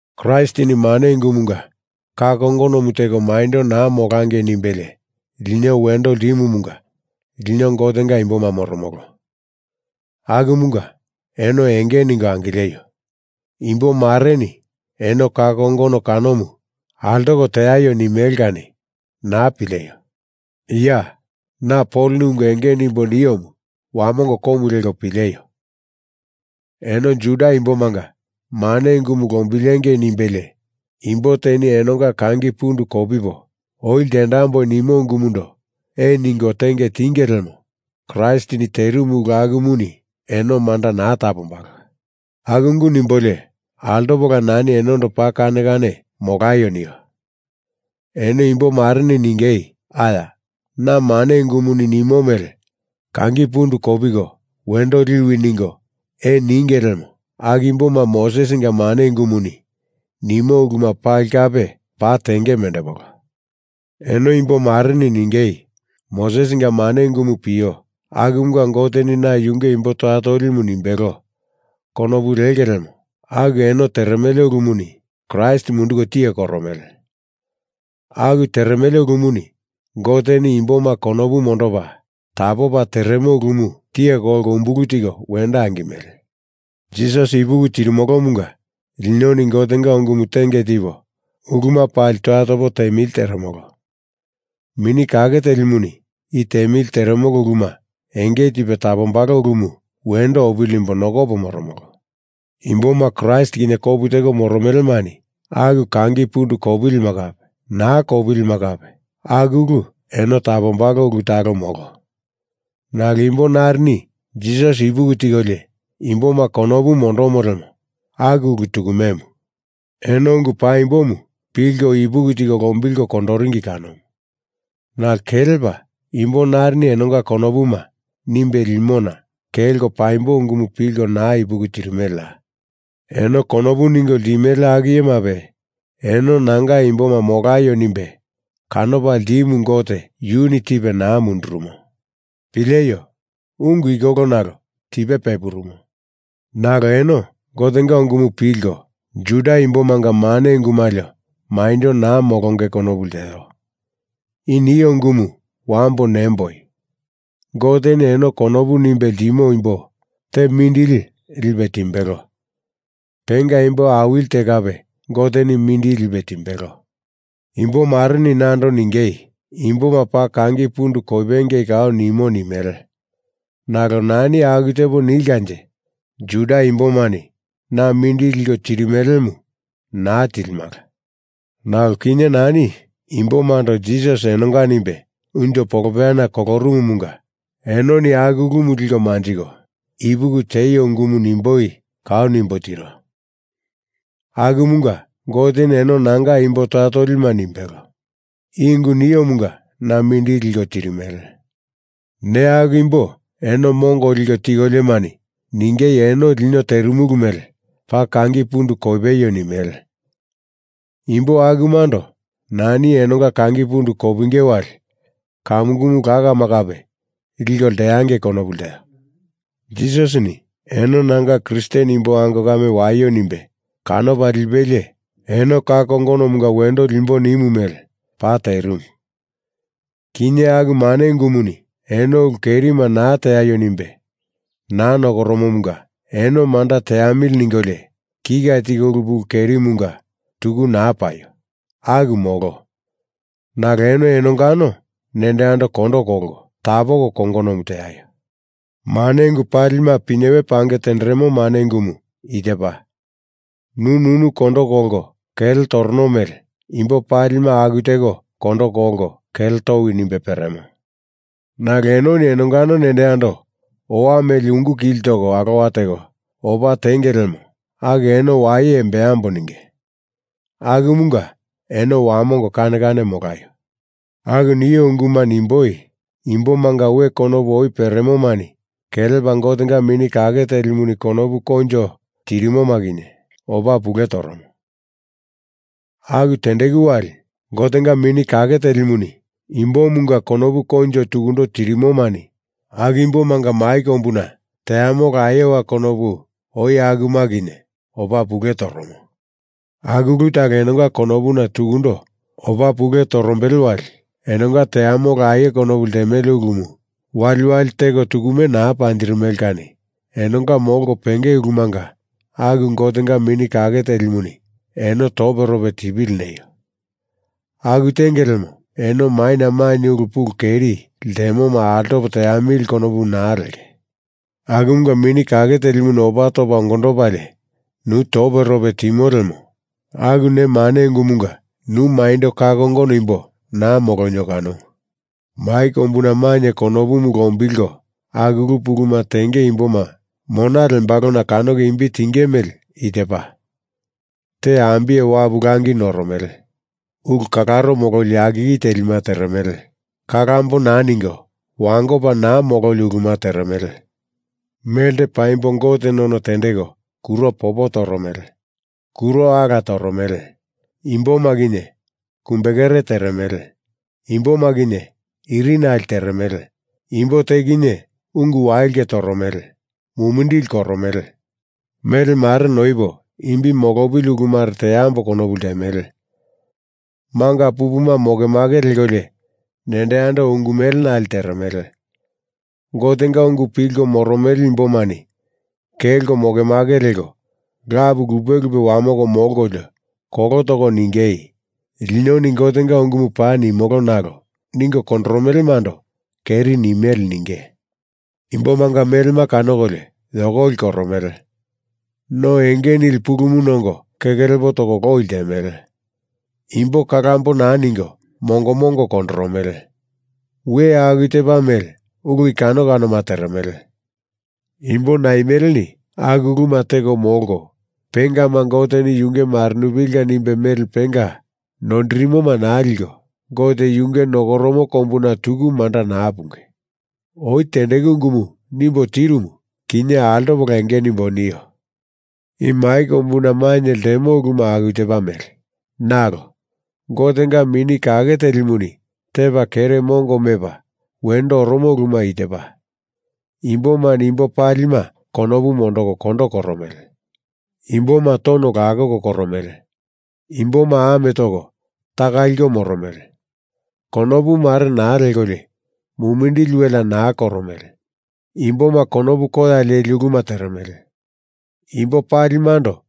Kraistini mane ungumunga ka kongonomu teko maindo naa molangei nimbelie lino wendo ltimumunga lino Gotenga imboma moromolo. Akumunga eno enge ningo angileio. Imbomareni eno ka kongono kanomu altoko teaio nimele kani naa pileio! Ya! Na Poloni ungu enge nimbo niomu wamongo komu leko pileio. Eno Juda imbomanga mane ungumu lombilengei nimbelie imbo teni enonga kangi pundu kopipo oi ltendamboi nimo ungumundo ee ninge tenge tinge lemo Kraistini terimu ulu akumuni eno manda naa tapombalo. Aku ungu nimbolio altopola nani enondo paa kane kane molaio nio. Eno imbo mareni ningei aya na mane ungumuni nimo mele kangi pundu kopiko wendo liwi ningo ee ninge lemo aku imboma Mosesinga mane ungumuni nimo uluma pali kape paa tenge mendepolo. Eno imbo mareni ningei Mosesinga mane ungumu pio akumunga Goteni na yunge imbo toya tolimu nimbelo konopu lenge lemo aku enono teremele ulumuni Kraist munduko tiye koromele. Aku teremele ulumuni Goteni imboma konopu mondopa tapopa teremo ulumu tiye kolko umbulu tiko wendo angimele. Jisasi ipuki tirimolomunga linoni Gotenga ungumu tenge tipo uluma pali toya topo temili teremolo. Mini Kake Telimuni i temili teremolo uluma enge tipe tapombalo ulumu wendo opili nimbo nokopo moromolo. Imboma Kraist kinye kopu teko moromelemani aku kangi pundu kopilima kape naa kopilima kape aku ulu eno tapombalo ulu talo molo. Nalo imbo narini Jisasi ipuki tikolio imboma konopu mondomo lemo aku ulu tukumemu. Eno ungu paimbomu pilko ipuki tiko lombilko kondoringi kanomu. Nalo kelepa imbo narini enonga konopuma nimbe limona kelko paimbo ungumu pilko naa ipuki tirimeleya? Eno konopu ningo ltimele aku iyemape eno nanga imboma molaio nimbe kanopa ltimu Gote yuni tipe naa mundurumo. Pileio! Ungu i kolo nalo tipe pepurumo. Nalo eno Gotenga ungumu pilko Juda imbomanga mane ungu malio maindo naa molonge konopu lteo. I nio ungumu wambo nemboi Goteni eno konopu nimbe ltimo imbo te mindili lipe timbelo. Penga imbo awili te kape Goteni mindili lipe timbelo. Imbo mareni nando ningei imboma paa kangi pundu kopengei kau nimo nimele nalo nani aku tepo nilkanje Juda imbomani na mindili liko tirimelemu naa tilimala. Nalo kinye nani imbomando Jisasi enonga nimbe unjo polopeyana kolorumumunga enoni aku ulumu liko manjiko ipuki tieio ungumu nimboi kau nimbo tiro. Akumunga Goteni eno nanga imbo toya tolima nimbelo. I ungu niomunga na mindili liko tirimele. Neya aku imbo eno mongo liko tikoliomani ningei eno lino terimulu mele paa kangi pundu kopeio nimele. Imbo akumando nani enonga kangi pundu kopingei wali kamukumu lakama kape liko lteangei konopu lteo. Jisasini eno nanga Kristen imbo ango kame waio nimbe kanopa lipelie eno ka kongonomunga wendo limbo nimu mele paa terimu. Kinye aku mane ungumuni eno ulu kerima naa teaio nimbe naa nokoromomunga eno manda teamili ningolio kika tiko ulu pulu kerimunga tuku naa paio. Aku molo. Nalo eno enongano nendo yando kondo kolko tapoko kongonomu teaio. mane ungu palima pinyewe pange tenderemo mane ungumu i tepa, nu nunu kondo kolko kele torono mele imbo palima aku teko kondo kolko kele towi nimbe peremo. Nalo enoni enonga nendo yando owa mele ungu kili toko alowa teko opa tenge lemo aku eno waye embambo ninge. Akumunga eno wamongo kane kane molaio. Aku nio unguma nimboi, imbomanga we konopu oi peremomani kelepa Gotenga Mini Kake Telimuni konopu koinjo tirimoma kinye opa pule toromo. Aku tendeku wali Gotenga Mini Kake Telimuni imbomunga konopu koinjo tukundo tirimomani aku imbomanga mai kombuna teamolo aie konopu oi akuma kinye opa pule toromo. Aku ulu talo enonga konopuna tukundo opa pule torombele wali enonga teamolo aie konopu ltemele ulumu waliwali teko tukume naa panjirimele kani enonga molko penge ulumanga aku Gotenga Mini Kake Telimuni eno toperope tipili neio. Aku tenge lemo eno maina mainye ulu pulu keri ltemoma altopo teamili konopu naa lenge. Akumunga Mini Kake Telimuni opa topa ongondopalie nu toperope timo lemo aku ne mane ungumunga nu maindo ka kongono imbo naa molonio kanomu. Mai kombuna mainye konopumu lombilko aku ulu puluma tenge imboma mona lembalona kanoko imbi tinge mele i tepa, Te ambiye wapu langi noromele. Ulu kalaro mololi yakiki telima teremele. Kalambo naa ningo wangopa naa mololi uluma teremele. Melte paimbo Gote none tendeko kuro popo toromele. Kuro ala toromele. Imboma kinye kumbekere teremele. Imboma kinye iri nale teremele. Imbo te kinye ungu wailke toromele. Mumindili koromele. Mele mare noipo imbi molopili ulumare teambo konopu ltemele. Manga pupuma mokemake lekolio nendo yando ungu mele nale teremele. Gotenga ungu pilko moromele imbomani kelko moke make leko lapu lupe lupe wamoko molkolio kolo toko ningei linoni Gotenga ungumu paa nimolo nalo ningo kondoromelemando keri nimele ninge. Imbomanga melema kanokolio yokoli koromele. No enge nili pulumu nongo keke lepo toko loi ltemele. Imbo kalambo naa ningo mongo mongo kondoromele. We aku tepa mele ulu i kano kanoma teremele. Imbo naimeleni aku uluma teko molko pengema Goteni yunge marenupilinga nimbe mele penga noindirimoma naa liko Gote yunge nokoromo kombuna tuku manda naa punge. Oi tendeku ungumu nimbo tirumu kinye altopola enge nimbo nio. I mai kombuna mainye ltemo uluma aku tepa mele nalo Gotenga Mini Kake Telimuni tepa kere mongo mepa wendo oromo uluma i tepa. Imbomani imbo palima konopu mondoko kondo koromele. Imboma tono lakoko koromele. Imboma ame toko taka liko moromele. Konopu mare naa lekolio mumindili welea naa koromele. Imboma konopu koya leli uluma teremele. Imbo palimando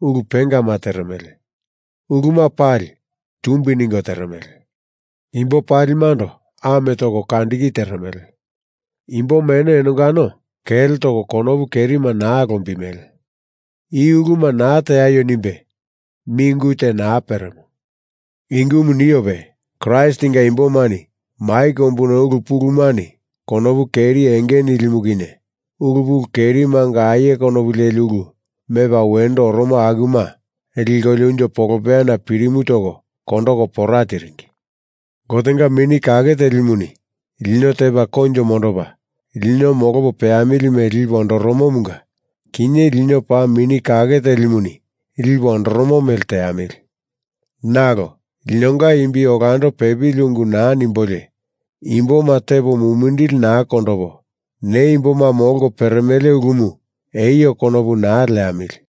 ulu pengama teremele. Uluma pali tumbi ningo teremele. Imbo palimando ame toko kandiki teremele. Imboma eno enongano kele toko konopu kerima naa lombimele. I uluma naa teaio nimbe mi ungu te naa peremo. I ungumu niope, Kraistinga imbomani mai kombuna ulu pulumani konopu keri enge nilimu kinye ulu pulu kerimanga aie konopu leli ulu mepa wendo oromo akuma likolio unjo polopeyana pirimu toko kondoko pora tiringi. Gotenga Mini Kake Telimuni lino tepa koinjo mondopa lino molopo peamili mele lipe ondoromomunga kinye lino paa Mini Kake Telimuni lipe ondoromo mele teamili. Nalo linonga imbi olando pepili ungu naa nimbolio imboma tepo mumindili naa kondopo ne imboma molko peremele ulumu eio konopu naa leamili.